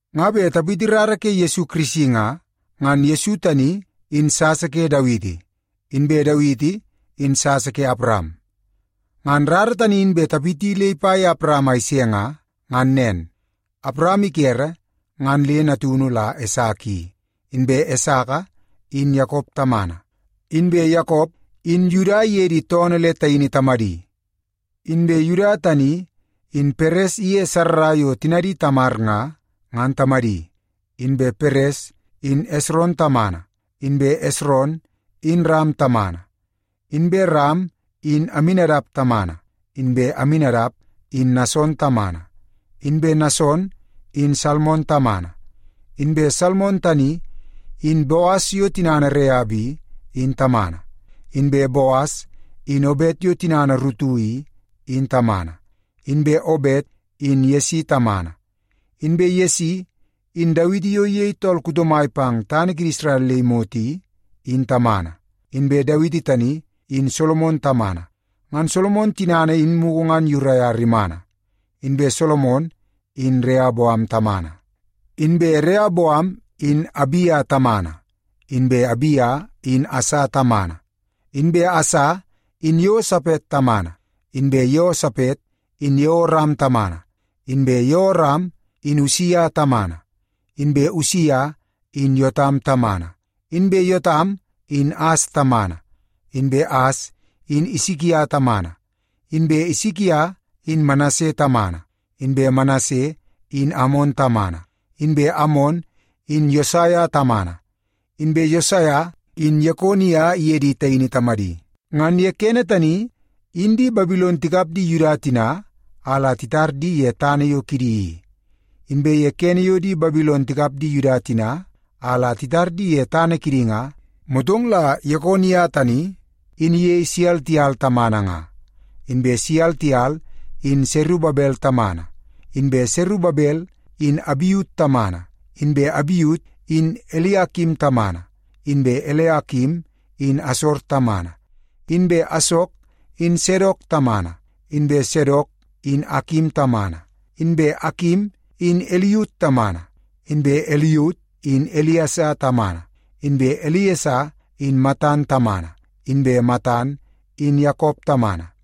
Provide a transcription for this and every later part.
Nga bet tapiti rara ke Yesu Kirisi nga, ngan Yesu tani, in sasa ke Dawiti, inbe Dawiti in sasa ke Awaram. Ngan rara tani in bet tapiti le ipa ye Awaram a ise nga, ngan nen. Awaram ikere ngan le natunu la Esaka i. Inbe Esaka in Yakop tamana. Inbe Yakop in Yuda iye di toonoo le taini tamadi. Inbe Yuda tani in Peres iye Sarra yo tinadi Tamar nga, ngan tamadi. Inbe Peres in Esron tamana. Inbe Esron in Ram tamana. Inbe Ram in Aminadap tamana. Inbe Aminadap in Nason tamana. Inbe Nason in Salmon tamana. Inbe Salmon tani, in Boas yo tinana Reap i, in tamana. Inbe Boas in Obet yo tinana Rutu i, in tamana. Inbe Obet in Yesi tamana. Inbe Yesi in Dawiti yo iyei tool kuto mai pang tana kidi Isrel le imot i, in tamana. Inbe Dawiti tani in Solomon tamana. Ngan Solomon tinana in mugu ngan Uria rimana. Inbe Solomon in Reoboam tamana. Inbe Reoboam in Abia tamana. Inbe Abia in Asa tamana. Inbe Asa in Yeosapet tamana. Inbe Yeosapet in Yeoram tamana. Inbe Yeoram in Usia tamana. Inbe Usia in Yotam tamana. Inbe Yotam in As tamana. Inbe As in Isikia tamana. Inbe Isikia in Manase tamana. Inbe Manase in Amon tamana. Inbe Amon in Yosaia tamana. Inbe Yosaia in Yekonia iye di taini tamadi. Ngan ye kene tani in di Babilon tikap di Yuda tina a la titar di ye tana yo kidi i. Inbe ye kene yo di Babilon tikap di Yuda tina a la titar di ye tana kidi nga, motong la Yekonia tani in iyei Seltiel tamana nga. Inbe Seltiel in Serubabel tamana. Inbe Serubabel in Abiut tamana. Inbe Abiut in Eliakim tamana. Inbe Eliakim in Asor tamana. Inbe Asor in Sadok tamana. Inbe Sadok in Akim tamana. Inbe Akim in Iliut tamana. Inbe Iliut in Iliesa tamana. Inbe Iliesa in Matan tamana. Inbe Matan in Yakop tamana.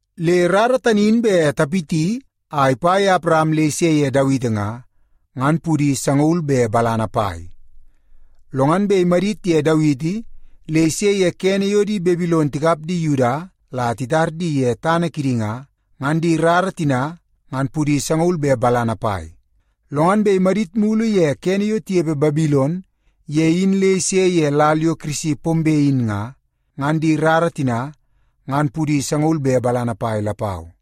Le rara tani in bet tapiti a ipa ye Awaram le ise ye Dawiti nga, ngan pudi sangaul be balana pai. Lo ngan bet imadit ye Dawiti le ise ye kene yo di Babilon tikap di Yuda la titar di ye tana kidi nga, ngan di rara tina ngan pudi sangaul be balana pai. Lo ngan bet imadit mulu ye kene yo tinepe Babilon ye in le ise ye lal yo Kirisi pombe in nga, ngan di rara tina ngan pudi sangaul be balana pai lapau.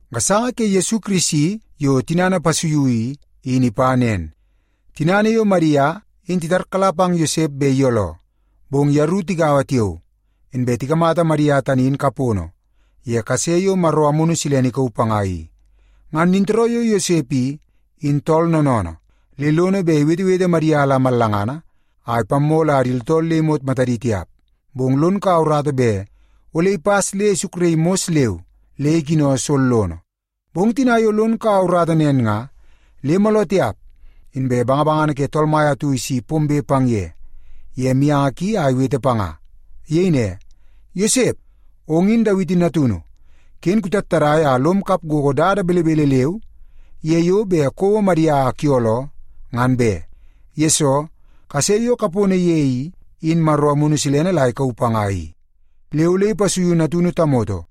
Gasanga ke Yesu Kirisi yo tinana ipasuiu i, in ipa nen. Tinana yo Madia in titarkala pang Yosep bet iyooloo, bong yeru tigaua tiao, inbe tikamata Madia tani in kapono ye kase yo Maro Amunu Silene ikauu panga i. Ngan nintooroo yo Yosep i, in tool noonoonoo, le lono bet iwetewete Madia la mallangana a ipammoo la di tooltool le imot matadi tiap. Bong lon kaua urata bet ole ipas le isukraii mos leu le ikino sollono. Bong tina yo lon kaua urata nen nga, le mooloo tiap inbe bangabangana ke Tool Mai atu isi pombe pang ye, ye mianga ki a iwete panga. Iyei ne, “Yosep, ong in Dawiti natunu. Ken kutattadai a lom kap gogo dada belebele leu ye yo bet kouo Madia a kuyooloo, ngan be, yesoo kase yo kapono ye i, in Maro Amunu Silene la ikauu panga i. Le ole ipasuiu natunu tamoto,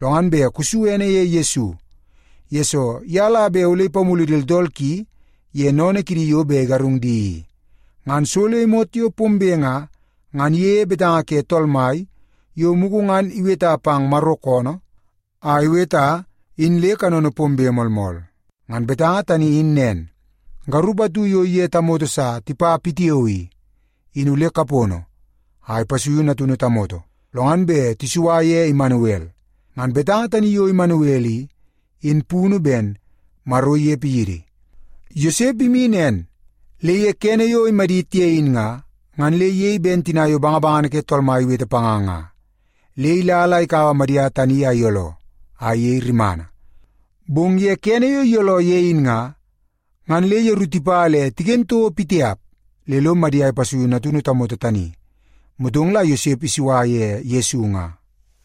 lo ngan bet kusu ene ye Yesu, yesoo ye la bet ole ipamulu di tooltool ki ye sennene kidi yo bet igarung di i.” Ngan so le imot yo pombe nga, ngan iyeie betanga ke Tool Mai yo mugu ngan iweta pang Maro koonoo a iweta in le kanono pombe moolmool. Ngan betanga tani in nen, “Garup atu yo iye tamoto sa tipa pitiao i, in ole kapono a ipasuiu natunu tamoto, lo ngan bet tisua ye Imanuel.” Ngan betanga tani yo Imanuel i, in punu ben, “Maro inepe yidi.” Yosep imi nen, le kene yo imadit ye in nga, ngan le iyei ben tina yo bangabangana ke Tool Mai iwete panga nga. Le ila la ikaua Madia tani a iyooloo, a iyei rimana. Bong kene yo iyooloo ye in nga, ngan le yeru tipa le tiken toko pitiap le lo Madia ipasuiu natunu tamoto tani. Motong la Yosep isua ye Yesu nga.